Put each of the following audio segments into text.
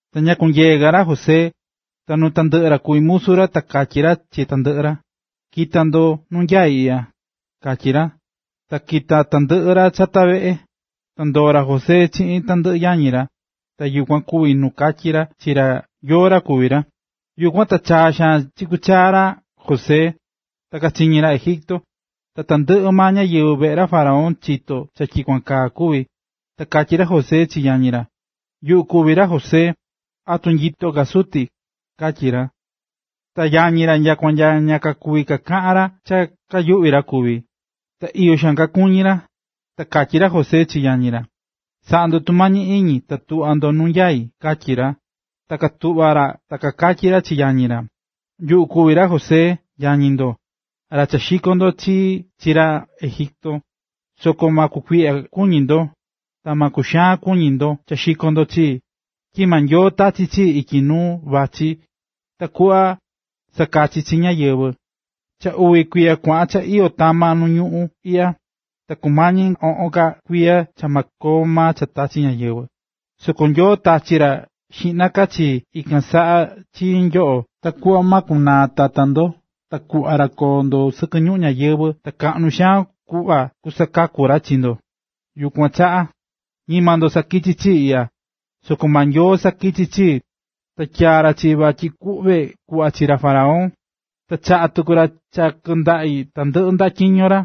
Ta ña kunyeé ka ra José, ta nuu tandɨꞌɨ ra kuví musu ra, ta katyí ra chi tandɨꞌɨ ra: “¡Ki̱ta tandɨꞌɨ ndo nuu nyaí iꞌya!”, katyí ra. Ta kita̱ tandɨꞌɨ ra chata veꞌe, ta ndoo̱ ra José chiꞌin tandɨꞌɨ yañi ra, ta yukuan kuvi̱ nu katyí ra chi ra yóó ra kuví ra. Yukuan ta chaa xaan kichaꞌa̱ chakú chaa ra José, ta kachiñí ra Egipto, ta tandɨꞌɨ maa ñáyɨvɨ veꞌe ra faraón chito̱ cha tyikuan kaa kuvi̱. Ta katyí ra José chi yañi ra: ―Yuꞌu kuví ra José. ¿Atu nyito ka suti? ―katyí ra. Ta yañi ra nyakua ña kuví kakaꞌan ra cha katyi cha kayuꞌví ra. Ta iyo kakuñí ra. Ta katyí ra José chi yañi ra: ―Sa̱ꞌa ndo tumañi iñi ta tuꞌva ndo nu nyai ―katyi ra. Ta katuꞌva̱ ra ta katyí ra chi yañi ra: ―Yuꞌu kuví ra José, yañi ndo, ra cha xiko̱ ndo chii chi ra Egipto. Soko ma kukuiꞌya kuñi ndo, ta ma kuxaan kuñi ndo cha xiko̱ ndo chii, tyi maa Nyoo tachi̱ chii ityi nuu vatyi takuꞌva sakaki chi ñáyɨvɨ. Cha uvi kuiya kuaꞌan cha iyó tama ñuu iꞌya, ta kumañi oꞌon ka kuiya cha ma koo cha tachi ñáyɨvɨ. Soko Nyoo tachi̱ ra xiꞌna ka chii ikan saꞌa chi nyoꞌo ta kuꞌva ma kunaa tata ndo ta kuꞌva ra koo ndo sɨkɨ ñuꞌún ñáyɨvɨ ta kaꞌnu xaan kuꞌva kusakaku ra chi ndo. Yukuan chaꞌa, ñima ndo sakichi̱ chii iꞌya, soko maa Nyoo sakichi̱ chii, ta tyaa̱ ra chii vatyi kuꞌve kuꞌva chi ra faraón, ta chaꞌa̱ tuku ra cha kɨndaꞌi tandɨꞌɨ ndaꞌa tyiño ra,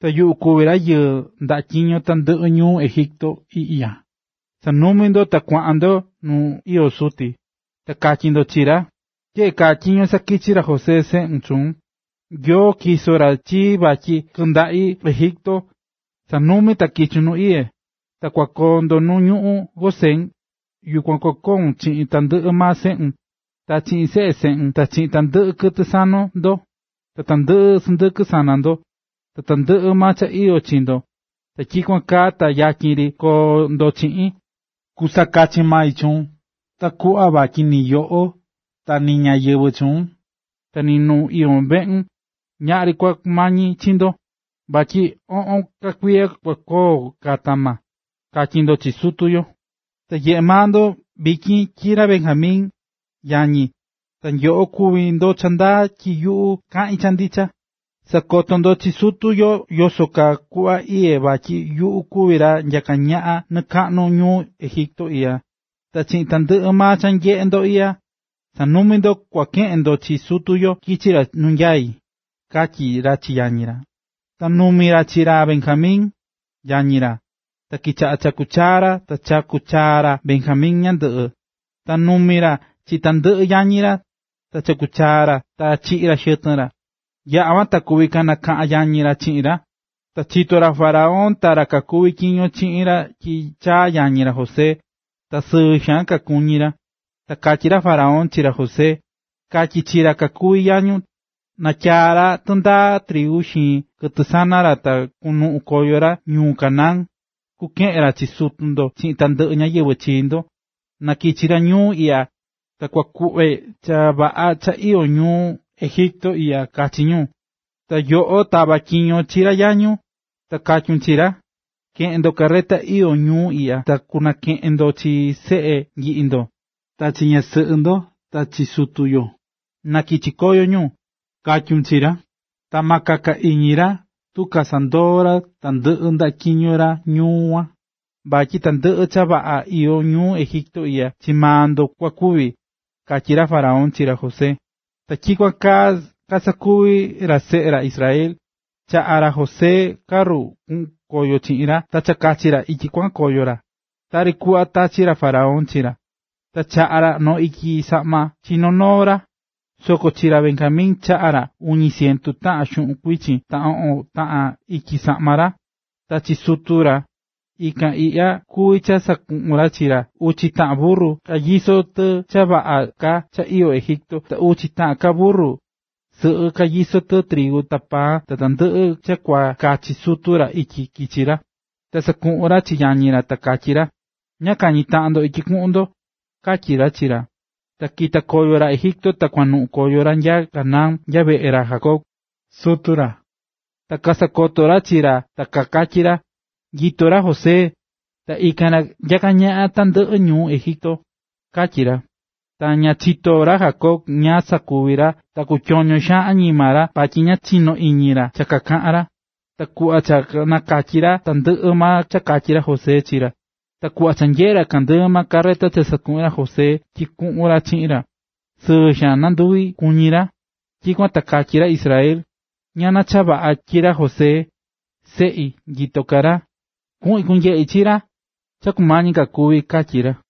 ta yuꞌu kuví ra yɨꞌɨ́ ndaꞌa tandɨꞌɨ ñuu Egipto iꞌya. Sa̱numi ndo ta kua̱ꞌan ndo nu iyó suti, ta ka̱tyi ndo chi ra: “Tyeꞌe kaa tyiño sakichí ra José, seꞌun, chuun: Nyoo tyiso̱ ra chii vatyi kɨꞌɨ ndaꞌi tandɨꞌɨ Egipto, sa̱numi ta kichun nu iyé. Ta kua koo ndo nu ñuꞌún Gosén, yukuan kua koun chiꞌin tandɨꞌɨ maa seꞌun, ta seꞌe seꞌun ta chiꞌin tandɨꞌɨ kɨtɨ sana ndo, ta tandɨꞌɨ sɨndɨkɨ sana ndo, ta tandɨꞌɨ maa cha iyó chi ndo. Ta tyikuan kaa ta yatyin ri koo ndo chiꞌin. Kusakachi mai chuun ta kuꞌva vatyi ni yoꞌo ta ni ñáyɨvɨ chuun, ta ni ñu iyó veꞌun, ñaꞌri kua kumañi chi ndo, vatyi oꞌon ka kuiya kua koo tama”, katyi ndo chi sutu yo. Ta nyeꞌé maa ndo vityin tyi ra Benjamin, yañi, ta nyoꞌo kuvi ndo cha ndaa tyi yuꞌu kaꞌín cha ndicha. Sa̱koto ndo chi sutu yo yoso kuꞌva iyé vatyi yuꞌu kuví ra nyaká ñaꞌan nɨɨ kaꞌnu ñuu Egipto iꞌya, ta chiꞌin tandɨꞌɨ maa cha nyeꞌe ndo iꞌya. ¡Sa̱numi ndo, kua keꞌen ndo chi sutu yo kichi ra ñuu iꞌya! ―katyí ra chi yañi ra. Ta nanumi̱ ra chi ra Benjamin, yañi ra, ta kichaꞌa̱ chakú chaa ra ta chakú chaa ra Benjamin ñandɨꞌɨ. Ta nanumi̱ ra chi tandɨꞌɨ yañi ra, ta chaku̱ chaa ra, ta chiꞌi̱ ra xɨtɨn ra. Yaꞌa̱ kuan ta kuvi̱ kanakaꞌa̱n yañi ra chiꞌin ra. Ta chito̱ ra faraón ta ra kakuví tyiño chiꞌin ra tyi chaa̱ yañi ra José, ta sɨɨ xaan kakuñí ra. Ta katyí ra faraón chi ra José: ―Ka̱tyi chi ra kakuví yañun na katyaa ra tɨndaa trigu xiin kɨtɨ sana ra ta na kunuꞌun koyo ra ñuu Canaán, kukeꞌen ra chi sutu ndo chiꞌin tandɨꞌɨ ñáyɨvɨ chi ndo, ta na kichi ñu ñuu iꞌya, ta kua kuꞌve cha vaꞌa cha iyó ñuu Egipto iꞌya kachi ñu. Ta yoꞌo tava tyiño chi ra yañun, ta katyun chi ra: “Keꞌen ndo carreta iyó ñuu iꞌya ta kunakeꞌen ndo chi seꞌe nyiꞌi ndo, ta chi ñasɨꞌɨ ndo ta chi sutu yo, nakichi koyo ñu”, katyun chi ra. Ta ma kaka iñi ra tu kasandoo ra tandɨꞌɨ ndaꞌa tyiño ra ñuu kuan, vatyi tandɨꞌɨ cha vaꞌa iyó ñuu Egipto iꞌya chii maa ndo kua kuvi ―katyí ra faraón chi ra José. Ta tyikuan kaa kasakuvi̱ ra seꞌe ra Israel. Chaꞌa̱ ra José carru kuꞌun koyo chiꞌin ra ta cha kakachi ra ityi kuaꞌan koyo ra, tari kuꞌva tachi̱ ra faraón chi ra. Ta chaꞌa̱ ra noo ityi saꞌma chi noo noo ra, soko chi ra Benjamin chaꞌa̱ ra uñi cientu taꞌan xuꞌun kuichin ta oꞌon taꞌan ityi saꞌma ra. Ta chi sutu ra, ikan iꞌya kuví cha sakuꞌu̱n ra chi ra: uchi taꞌan burru kanyisó tɨ cha vaꞌa ka cha iyó Egipto, ta uchi taꞌan ka burru sɨꞌɨ kanyisó tɨ trigu ta paan ta tandɨꞌɨ cha kua kachi sutu ra ityi kichi ra. Ta sakuꞌu̱n ra chi yañi ra, ta katyí ra: ―Ñaꞌa kañi taꞌan ndo ityi kuꞌun ndo ―katyí ra chi ra. Ta kita̱ koyo ra Egipto ta kuaꞌan koyo ra nya Canaán nya veꞌe ra Jacob, sutu ra. Ta kasakoto̱ ra chi ra ta kakatyí ra: ―¡Nyito ra José! ¡Ta ikan ra nyaká ñaꞌan tandɨꞌɨ ñuu Egipto! ―katyí ra. Ta ña chitó ra Jacob ñáá sakuvi ra ta kutyoño xaan añima ra vatyi ña chinó iñi ra cha kakaꞌán ra. Ta kuꞌva cha kanakatyi̱ ra tandɨꞌɨ cha katyi̱ ra José chi ra, ta kuꞌva cha nanyeꞌe̱ ra tandɨꞌɨ carreta cha sakuꞌu̱n ra José tyi kuꞌun ra chiꞌin, sɨɨ xaan nanduvi kuñí ra. Tyikuan ta katyí ra Israel: “¡Ñana cha vaꞌa, tyi ra José, seꞌi, nyito ka ra! ¡Kuꞌin kunyeꞌi chi ra cha kumañi ka kúvi!”, katyí ra.